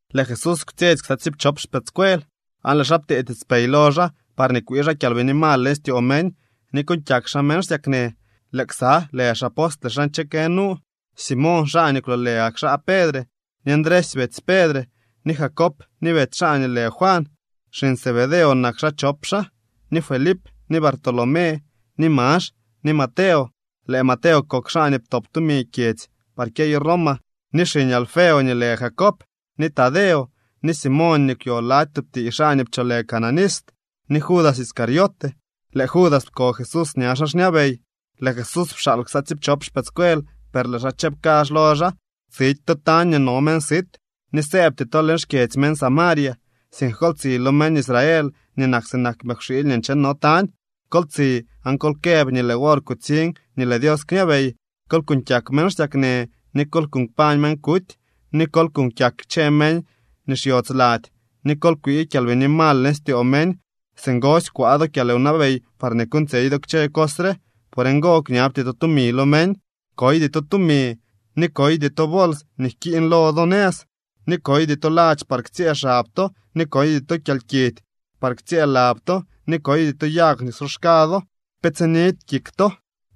Lëë Jesús kwtsyetsy ksa tsiipchop xpëëdscuel, aan lëë xaa ptee tiitspey lo xaa parñee kwii xaa kyalbini mal leñ styoo meñ, ni kuuñ kyak xaa meñ xsyaknë. Lëë ksa lë xapostle xaa nche kë nu: Simoñ, xaa nii kwloolë gak xaa Pedre, ni Ndresy betsy Pedre, ni Jacob ni betsy xaa nii lë Juan (Xiñ Zebedeo nak xaa chop xaa), ni Felip ni Bartolomé, ni Max ni Mateo (Lëë Mateo kok xaa nii ptop tumi kyedzy par kyeyo Roma), ni xiñ Alfeo nii lë Jacob ni Tadeo, ni Simoñ nii kwyo lady tub tiiy xaa nii pcholë Cananista ni Judas Iscariote (Lëë Judas pko Jesús ña xaa xñabey). Lëë Jesús pxaal ksa tsiipchop xpëëdscuel, per lëë xaa chëb kazh lo xaa: —Tsidy to tañ nii no meñ sit, ni sëëbty to leñ xkyedzy meñ Samaria. Sink kol tsi lo meñ Israel nii nak sinak mëkwxiily nii ncheno tañ. Kol tsi aan kol këb nii lëë wor kutsiñ nii lëë Dios kñabey. Kol kuñ kyak meñ xsyaknë, ni kol kuñ kpañ meñ kuty, ni kol kuñ kyak kchë meñ nii xyodz lady, ni kol kwii kyalbini mal leñ styoo meñ. Singosy kwaa do kyalwnabey parñee kuuñtsyey do kchë cos re. Por ngo, kñabty to tumi lo meñ. ’Koydy to tumi, ni koydy to bols nii jkiiñ lo do nëz. Ni koydy to ladx par ktsyëë xab to ni koydy to kyalkidy par ktsyëë lab to, ni koydy to yag nii ksoxka do. Pe tsinidy kik to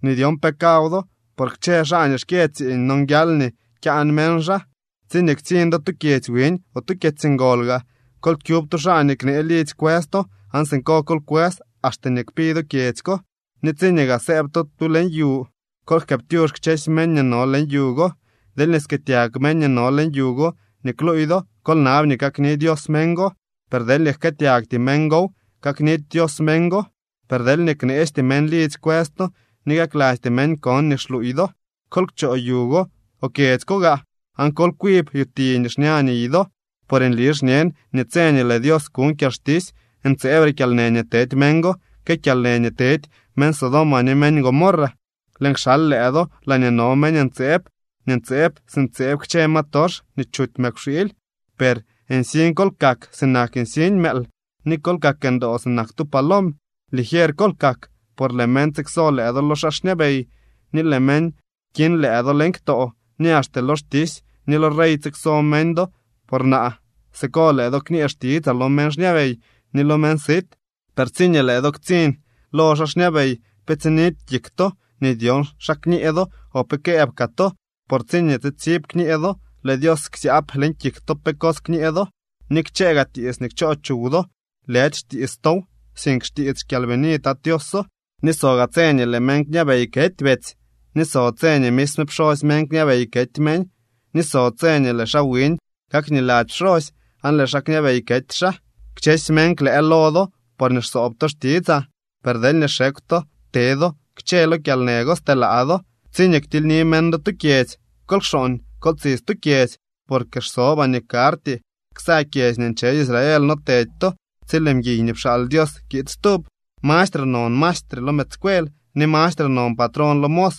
nii dyon pe kaw do, por kchë xaa nii xkyë tsiiñ nonguial nii kyaan meñ xaa. ’Tsiñee ktsiñ do tu kyedzy wiñ o tu kyedzy ngol gaa, kol kyub tu xaa nii knee lidzy kwës to aan siko kol kwës axte nii kpi do kyedzy ko. Ni tsiñee gaa sëëb to tu leñ yu, kol jkëëptyux kchësy meñ nii no leñ yu go. Deelñee skëëtyag meñ nii no leñ yu go nii kluuy do, kol nab nii kakni Dios meñ go, per deelñee jkëëtyagty meñ gow kaknidy Dios meñ go. Per deelñee kneesty meñ lidzy kwës to ni kaklasty meñ kon nii xluuy do, kol kchoo yu go o kyedzy go gaa, aan kol kwib yuti nii xña niy do. Por nli xñen nii tse nii lëë Dios kuñ kyalxtisy, ntseebre kyalnë nii tedy meñ go que kyalnë nii tedy meñ Sodoma ni meñ Gomorra. ’Lëën kxal lëë do laañee no meñ ntseeb nii ntseeb si ntseeb kchë ma tox nii chuty mëkwxiily. Per nsiñ kol kak sinak nsiñ mëël, ni kol kak ndoo sinak tu palom. Ligier kol kak, por lëë meñ tsikso lëë do lo xaa xñabey ni lëë meñ kiñ lëë do leñ ktoo. Ni axte lo xtisy ni lo rey tsikso meñ do por naa. Siko lëë do kñee xtitsaa lo meñ xñabey ni lo meñ sit. Per tsiñee lëë do ktsiñ lo xaa xñabey pe tsinidy kik to nii dyon xa kñee do o pe këëb kaa to, por tsiñee tsitsib kñee do, lëë Dios ksyaab leñ kik to pe cos kñee do. Ni kchëë gaa tiits nii kchoo chuw do, lëdy xtiits tow, sink xtiits xkyalbini Tat Tioso. ’Ni so gaa tse nii lëë meñ kñabey kety betsy ni so tse nii misme pxosy meñ kñabey kety meñ, ni so tse nii lëë xaa wiñ kakniladzy pxosy aan lëë xaa kñabey kety xaa. Kchësy meñ klëë lo do, porñee xsoob to xtitsaa. Per deelñee xekw to te do kchë lo kyalnë go stelaa do. Tsiñee ktilyni meñ do tu kyedzy, kol kxooñ, kol tsi stu kyedzy. Porque xsobaa nii karty ksa kyedzy nii nche Israel no tedy to tsi lëë mguiy nii pxaal Dios kiid stub. ’Mastre non maestre lo mëëdscuel ni mastre non patrón lo mos.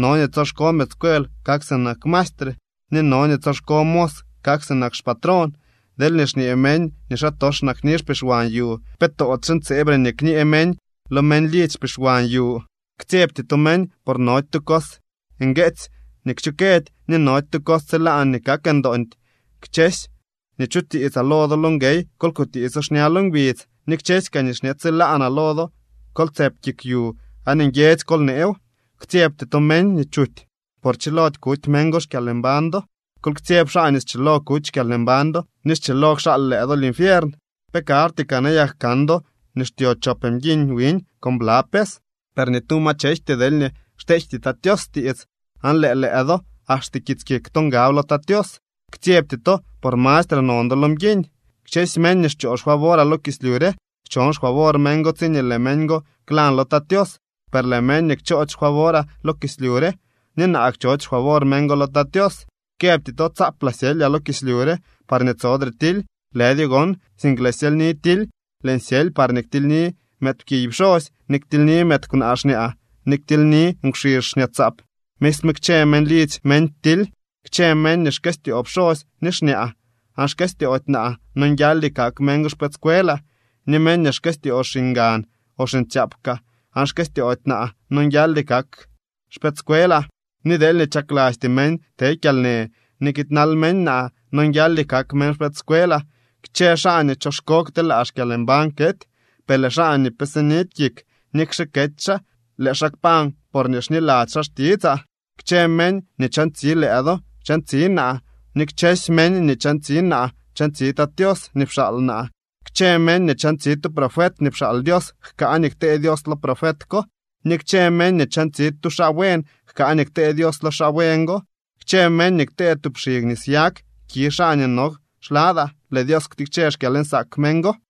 No nii tsoxko mëëdscuel kak sinak maestre, ni no nii tsoxko mos kak sinak xpatrón. Deelñee xñee meñ nii xaatox nakni xpixwan yu, ¿pe toodyxe ntseebre nii kñee meñ lo meñ lidzy xpixwan yu? ’Ktsyebty to meñ, por nody tu cos ngueetsy nii kchukëdy, ni nody tu cos tsilaan nii kak ndoondy. Kchësy nii chutiitsaa lo do lo nguey kol kutiitso xña lo ngbidz. Ni kchësy kaa nii xñe tsilaanaa lo do kol tsëp kik yu aan nguiedzy kol neew. Ktsyebty to meñ nii chuty, por chilody kuty meñ go xkyalmbañ do. Kol ktsyeb xaa nii schilo kuty xkyalmbañ do ni schilo kxaal lëë do linfiern. ’¿Pe karty kaa nayak kan do nii xtyo chop mguiñ wiñ con bla pes? Per ni tu ma chejty deelñee xteejty Tat Tios tiits. Aan lëë lëë do axte kits kik to ngab lo Tat Tios. Ktsyebty to, por mastre non do lo mguiñ. ’Kchësy meñ nii xchoo xfavoraa lo kislyu re, schon xfavor meñ go tsiñee lëë meñ go klyañ lo Tat Tios. Per lëë meñ nii kchoody xfavoraa lo kislyu re, ni naa kchoody xfavor meñ go lo Tat Tios. ’Këbty to tsaaplaa syelyaa lo kislyu re parñee tsodre tily. Lëdyo gon, sink lëën syelyni tily. Lëën syely parñee ktilyni mëëdpkiy pxosy, ni ktilyni mëëd kwnaa xñaa, ni ktilyni nkwxizh xñaatsaap. Misme kchë meñ lidzy meñ ktily. ’Kchë meñ nii xkëstyoo pxosy ni xñaa aan xkëstyoody naa nonguialdy kak meñ go xpëëdscuelaa, ni meñ nii xkëstyoo xiñgan o xiñtsyaap kaa aan xkëstyoody naa nonguialdy kak xpëëdscuelaa. Ni deelñee chaklasty meñ te kyalnë ni kiidnaldy meñ naa, nonguialdy kak meñ xpëëdscuelaa. Kchë xaa nii choxko kteelaa xkyalmbañ kety. Per lëë xaa nii pe sinidy kik, nikxe kety xaa, lëë xaa kpañ porñee xniladzy xaa xtitsaa. ’Kchë meñ nii chantsi lëë do, chantsi naa. Ni kchësy meñ nii chantsi naa, chantsi Tat Tios nii pxaal naa. Kchë meñ nii chantsi tu profet nii pxaal Dios jkaa nii ktee Dios lo profet ko. Ni kchë meñ nii chantsi tu xaa buen jkaa nii ktee Dios lo xaa buen go. Kchë meñ nii ktee tub xig nis yag ki xaa nii no xladaa, lëë Dios ktikche xkyalnsaak meñ go.